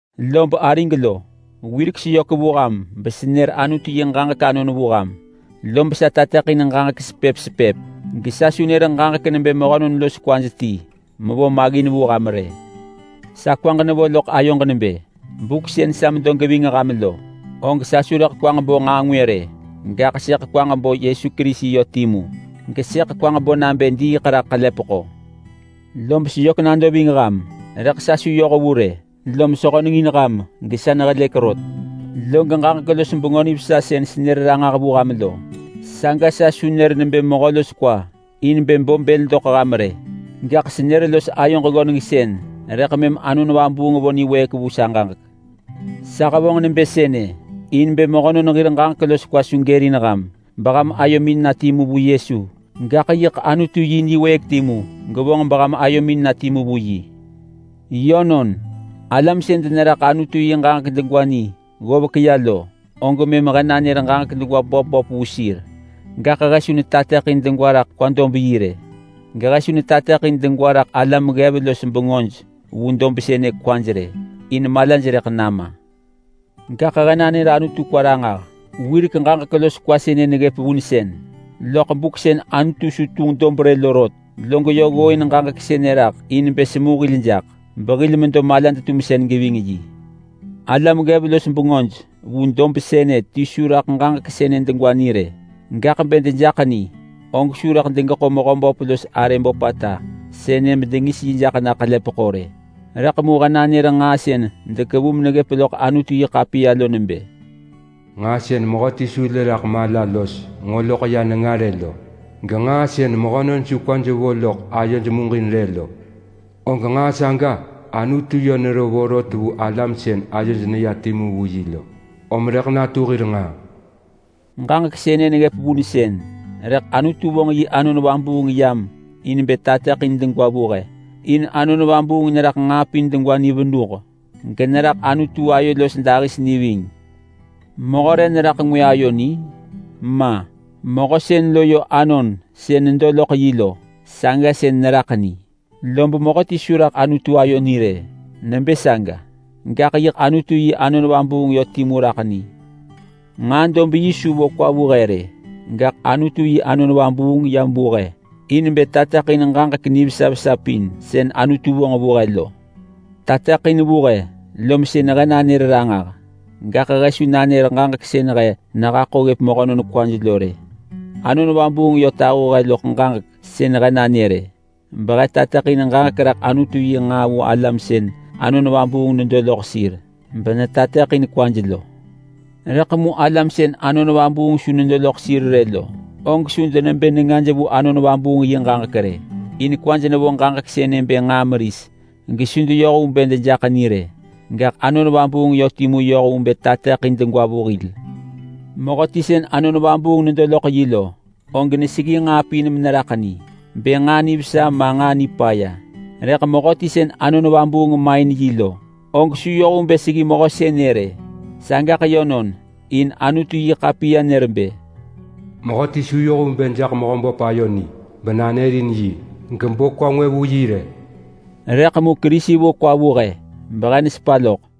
Lob arig lo, wirek seyök vu ham besenër Anutu yi ġaġek anon vu ham, lob sa tateḳin ġaġek sepëp sepëp gesa su nër ġaġek nebë mehönon los kwaj ti mevo maggin vu ham rë. Sa kwaġ nevo loḳ ayoġ nebë buk sën sa medo geving ham lo, og sa su rëḳ kwaġ bo nġaa ngwë rë, gaḳ sëḳ kwaġ bo Yesu Kerisi yö timu gesëḳ kwaġ bo nabë diiḳ raḳ ḳelepeḳo. Lob seyök nado ving ham, rëḳ sa su yoh vu rë, lom sehönengin ham gesa nehelëk rot. Log ġaġek los Bengö Nivesa sën senër ranġah vu ham lo, saga sa su nër nebë mehö los kwa in bë bo bël doḳ ham rë, gaḳ senër los ayoġ ggönengsën rëḳ mëm Anon Vabuung vo niwëëk vu sa ġaġek. Sa hevonġ nebë sënë in bë mehönon hir ġaġek los kwa su gërin ham beham ayomin na timu vu Yesu, gaḳ yiḳ Anutu yi niwëëk timu gevonġ beham ayomin na timu vu yi. Yönon, alam sën deneraḳ Anutu yi ġaġek degwa ni ggovek ya lo, og mëm he nanër ġaġek degwa böp böp vu sir. Gaḳ he su netateḳin degwa raḳ kwa dob yi rë, gehe su netateḳin degwa raḳ alam ggev los bengöj vu dob sënë kwaj rë. In malaj rëḳ nama lo. Gaḳ he nanër Anutu kwa ranġah. Wirek ġaġek los kwa sënë neggëp vunsën loḳ buk sën Anutu su tunġ dob rë lo rot. Log yö ggooin ġaġek sënë raḳ in bë semu hil jaḳ behil medo malad-tumsën. Alam ggev los bengöj vu dob sënë ti su raḳ ġaġek sënë degwa ni rë. Gaḳ bë dejaḳ ni, og su rëḳ degeḳo Mehöböp los arë böpata sënë bedengis yi jaḳ na ḳelepeḳo rë. Rëḳ mu he nanër nġaa sën dekevu meneggëp loḳ Anutu-yi-ḳapiya lo nebë: “Nġaa sën mehöti su lë raḳ mala los nġo loḳ ya nenga rë lo, genġaa sën mehönon su kwaj vo loḳ ayoj muġin rë lo, og nġaa saga Anutu yö nero vorot vu alam sën ayoj neya timu vu yi lo, om rëḳ natu hir nġaa.” Ġaġek sënë neggëp vunsën rëḳ Anutu vonġ yi Anon Vabuung yam in bë tateḳin degwa vu he. In Anon Vabuung neraḳ nġaa pin degwa ni venuh generaḳ Anutu ayo los dahis ni ving. Mehö re neraḳ ngwë ayo ni? Ma! Mehö sën lo yö anon sën nedo loḳ yi lo, saga sën neraḳ ni. Lob mehöti su raḳ Anutu ayo ni rë nebë saga, gaḳ yiḳ Anutu yi Anon Vabuung yö timu raḳ ni. Nġaa dob yi su vo kwa vu he rë, gaḳ Anutu yi Anon Vabuung yam vu he in bë tateḳin ġaġek nivesa vesa pin sën Anutu vonġ vu he lo. Tateḳin vu he lom sën he nanër ranġah. Gaḳ he su nanër ġaġek sën he nehaḳo ggëp mehönon kwaj lo rë. Anon Vabuung yö tahu he loḳ ġaġek sën he nanër-ë, behe netateḳin ġaġek raḳ Anutu yi nġaa vu alam sën Anon Vabuung nedo loḳ sir benetateḳin kwaj lo. Rëḳ mu alam sën Anon Vabuung su nedo loḳ sir rë lo, og su denebë nengaj vu Anon Vabuung yi ġaġek rë. In kwaj nevo ġaġek sënë bë nġaa meris gesu deyoh vu bë dejaḳ ni rë, gaḳ Anon Vabuung yö timu yoh vu bë tateḳin degwa vu hil. Mehöti sën Anon Vabuung nedo loḳ yi lo, og neseggi nġaa pin meneraḳ ni bë nġaa nivesa ma nġaa nipaya, rëḳ mehöti sën Anon Vabuung main yi lo, og su yoh vu bë seggi mehö sënë rë. Sagaḳ yönon, in Anutu-yi-ḳapiya nër bë: “Mehöti su yoh vu bë jaḳ Mehöböp ayo ni benanërin yi gebo kwa ngwë vu yi rë.” Rëḳ mu Kerisi vo kwa vu he behe nesepa loḳ.